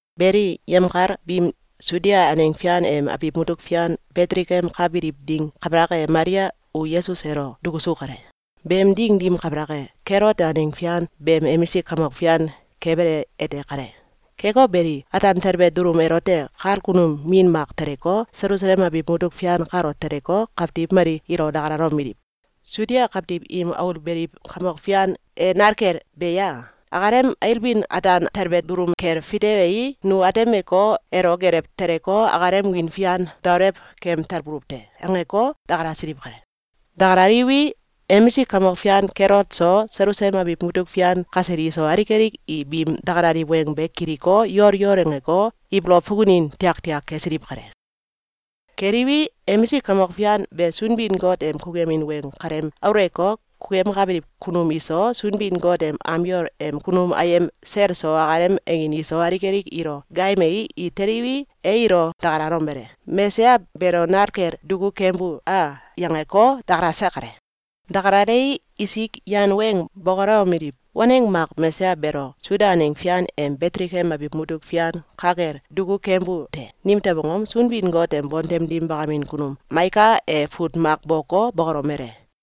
Beli, yemkal biim Sudia aneng fian em abiw mutuk fian Betelekem ka biliw ding kabalak e, Malia u Yesus elo dukusu kale. Beem ding dim kabalak e, Kelot e aneng fian beem emisik kamok fian kebele ete kale. Keko beli, ataan telbe dulum elote, kal kunum min mak teleko, Selusalem abiw mutuk fian kalo teleko, kawtiw mali ilo dakalalomeliw: “Suda kawtiw im aul beliw kamok fian e nal kel be ye? Akalem ailbin ataan talbe dulum kel fitewei, nu atemeko, elo gelew teleko, akalem wiin fian daolew kem talbuluw te.”, angeko, dakalasiliw kale. Dakalaliwi, emisik kamok fian Kelot so, Selusalem abiw mutuk fian kasel iso, alik alik i biim dakalaliw weng be kiliko, yol yol angeko, ibolow fukunin tiaktiak kesiliw kale. Keliwi, emisik kamok fian be Sunbin-Got em kukuyemin weng kalem aulewko, kukuyemkabiliw kunum iso, Sunbin-Got em am yol em kunum ayem sel eso, akalem angin iso, alik alik ilo gaayemei, i teliwi, e ilo dakalomele: “Mesaya beelo nal kel duku kembu a?”, yangeko, dakalase kale. Dakalalei, isik yan weng bokolewomeliw: “Waneng mak Mesaya beelo Sudia aneng fian em Betelekem abiw mutuk fian ka kel duku kembu te. Nimtew angom? Sunbin-Got em bontem dim bakamin kunum Maika e fut mak boko, bokolomele: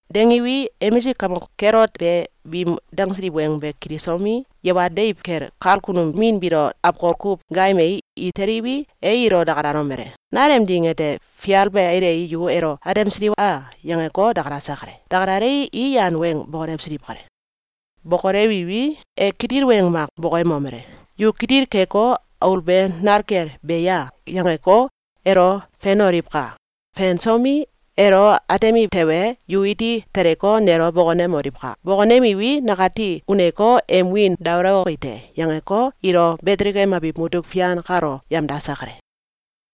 Dangiwi, emisik kamok Kelot be biim dangsiliw weng be kilisomi, yawal deiw kel kal kunum min biilo awkol kuw gaayemei, i teliwi, e ilo dakalalomele: “Nalem ding ete fial be ailei, yu elo atemsiliw a?”, yangeko, dakalase kale. Dakalalei, i yan weng bokolewsiliw kale. Bokolewiwi, e kitil weng mak bokoyemomele: “Yu kitil keko, ‘Aul be nal kel be ya?’, yangeko, elo fenoliwka! Fensomi, elo atemiw tewe, yu iti teleko, nelo bokonemoliwka! Bokonemiwi, nakati uneko, em wiin daolewoki te.”, yangeko, ilo Betelekem abiw mutuk fian kalo yemdase kale.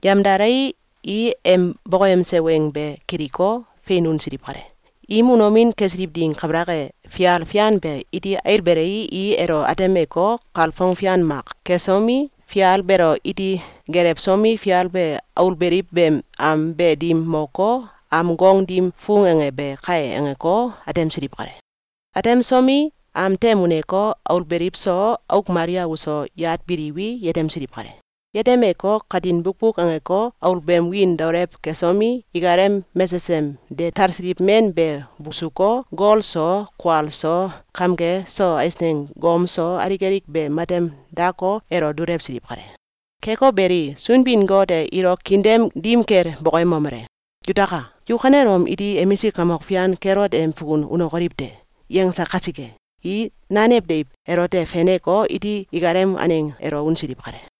Yemdalei, i em bokoyemse weng be kiliko, fein unsiliw kale. Im unomin kesiliw ding kabalak e, fial fian be iti ailbelei, i elo atemeko, kalfong fian mak kesomi, fial beelo iti gelewsomi, “Fial be aul beliw beem am be dim moko, am gong dim fung ange be kai!”, angeko, atemsiliw kale. Atemsomi, am tem uneko, aul beliw so, auk Malia uso yat biliwi, yetemsiliw kale. Yetemeko, katin bukbuk angeko, aul beem wiin daolew kesomi, ikalem mesesem de talsiliw men be busuko, gol so, kual so, kamge so ais gom so, alik alik be matem dako, elo dulewsiliw kale. Keko beli, Sunbin-Got e ilo kiin dem dim kel bokoyemomele: “Yutaka! Yu kanelom iti emisik kamok fian Kelot em fukun unokoliw te!”, yangse kasike, i nanew deiw elote feneko, iti ikalem aneng elo unsiliw kale.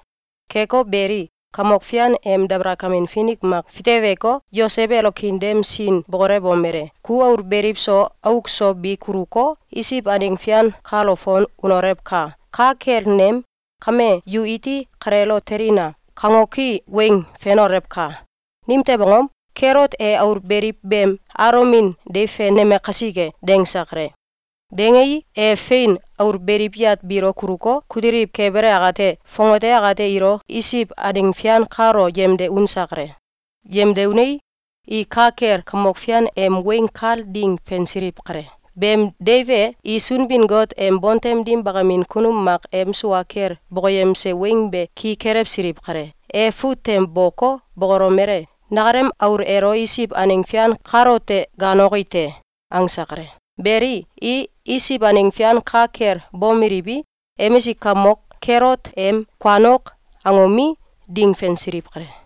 Keko beli, Kamok Fian em dabalakamin finik mak fiteweko, Yosew elo kiin dem sin bokolewomele: “Ku aul beliw so auk so bi kuluko, Isiw aneng fian kalo fon unolewka! Ka kel nem ‘Kame yu iti kaleelo telina!’, kangoki weng fenolewka! Nimtew angom? Kelot e aul beliw beem alomin deiw feneme kasike.”, dangse kale. Dangei, e fein aul beliw yat biilo kuluko, kutiliw kebele akate, fongate akate ilo Isiw aneng fian kalo yemde unse kale. Yemde unei, i ka kel Kamok Fian em weng kal ding fensiliw kale. Beem deiw e, i Sunbin-Got em bontem dim bakamin kunum mak em sua kel bokoyemse weng be ki kelewsiliw kale. E fut tem boko, bokolomele: “Nakalem aul elo Isiw aneng fian kalote gaaloki te.”, angse kale. Beli, i Isiw aneng fian ka kel bomeliwi, emisik kamok Kelot em “Kuanok!”, angomi, ding fensiliw kale.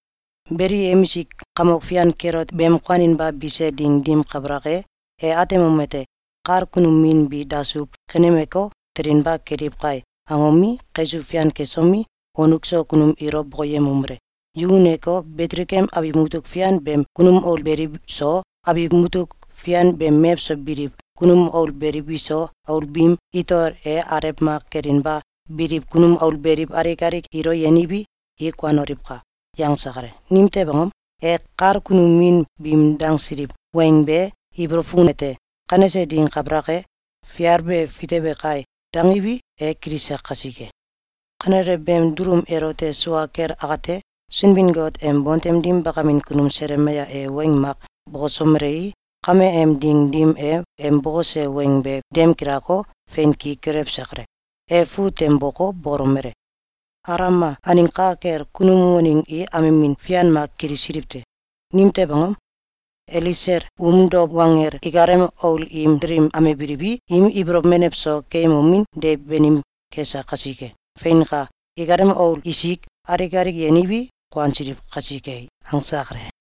Beli, emisik kamok fian Kelot beem kuaninba bise ding dim kabalak e, e atemomete: “Kal kunum min bi dasuw kenemeko, telinba keliw kai!”, angomi, kaisuw fian kesomi, wonuk so kunum ilo bokoyemomele: “Yu uneko, Betelekem abiw mutuk fian beem kunum aul beliw so, abiw mutuk fian beem mewso biliw kunum aul beliw biso, aul biim itol e alew mak kelinba biliw kunum aul beliw alik alik ilo yeniwi, i kuanoliwka!”, yangse kale. Nimtew angom? E kal kunum min biim dangsiliw weng be ibolow fukunete: “Kanese ding kabalak e, fial be fitewe kai.”, dangiwi, e kilise kasike. Kanele beem dulum elote sua kel akate, Sunbin-Got em bontem dim bakamin kunum Selemaya e weng mak bokosomelei, kame em ding dim e em bokose weng be dem gilako, fein ki kelewse kale. E fut tem boko, bokolomele: “Alama aneng ka kel, kunum waneng i amemin fian mak kilisiliw te. Nimtew angom? Elesel um dow wanggel ikalem aul im delim amebiliwi, im ibolow menew so keyemomin deiw banim kese kasike. Feinka! Ikalem aul isik alik alik yeniwi, kuansiliw kasike.”, angse kale.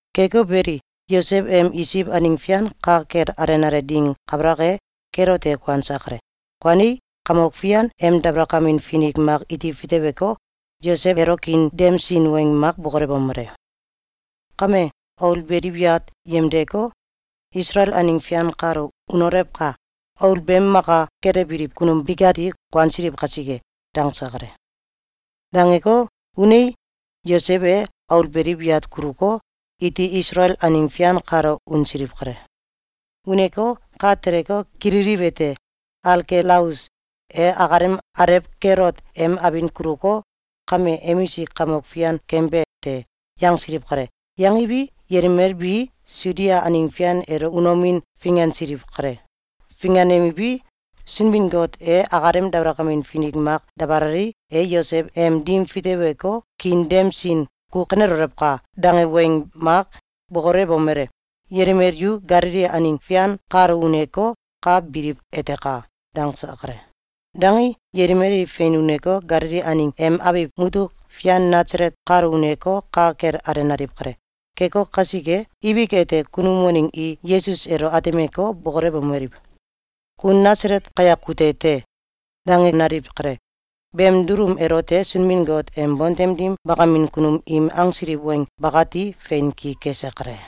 Keko beli, Yosew em Isiw aneng fian ka kel alenale ding kabalak e, Kelot e kuanse kale. Kuanei, Kamok Fian em dabalakamin finik mak iti fiteweko, Yosew elo kiin dem sin weng mak bokolewomele: “Kame, aul beliw yat yemdeko, Isalael aneng fian kalo unolewka! Aul beem maka kelewbiliw kunum bikati kuansiliw kasike.”, dangse kale. Dangeko, unei, Yosew e aul beliw yat kuluko, iti Isalael aneng fian kalo unsiliw kale. Uneko, ka teleko, kililiwete: “Alkelaus e akalem alew Kelot em abin kuluko, kame emisik kamok fian keembe te.”, yangsiliw kale. Yangiwi, yelimel bi Sudia aneng fian elo unomin fingansiliw kale. Finganemiwi, Sunbin-Got e akalem dabalakamin finik mak dabalei, e Yosew em dim fiteweko, kiin dem sin “Ku kanelolewka!”, dange weng mak bokolewomele: “Yelimel yu Galili aneng fian kalo uneko, ka biliw etaka!”, dangse kale. Dangei, yelimel i fein uneko, Galili aneng em abiw mutuk fian Nasalet kalo uneko, ka kel alenaliw kale. Keko kasike, ibik ete, kunum waneng i Yesus elo atemeko, bokolewomeliw: “Ku Nasalet kayak kute te!”, dangenaliw kale. Beem dulum elote Sunbin-Got em bontem dim bakamin kunum im angsiliw weng bakati fein ki kese kale.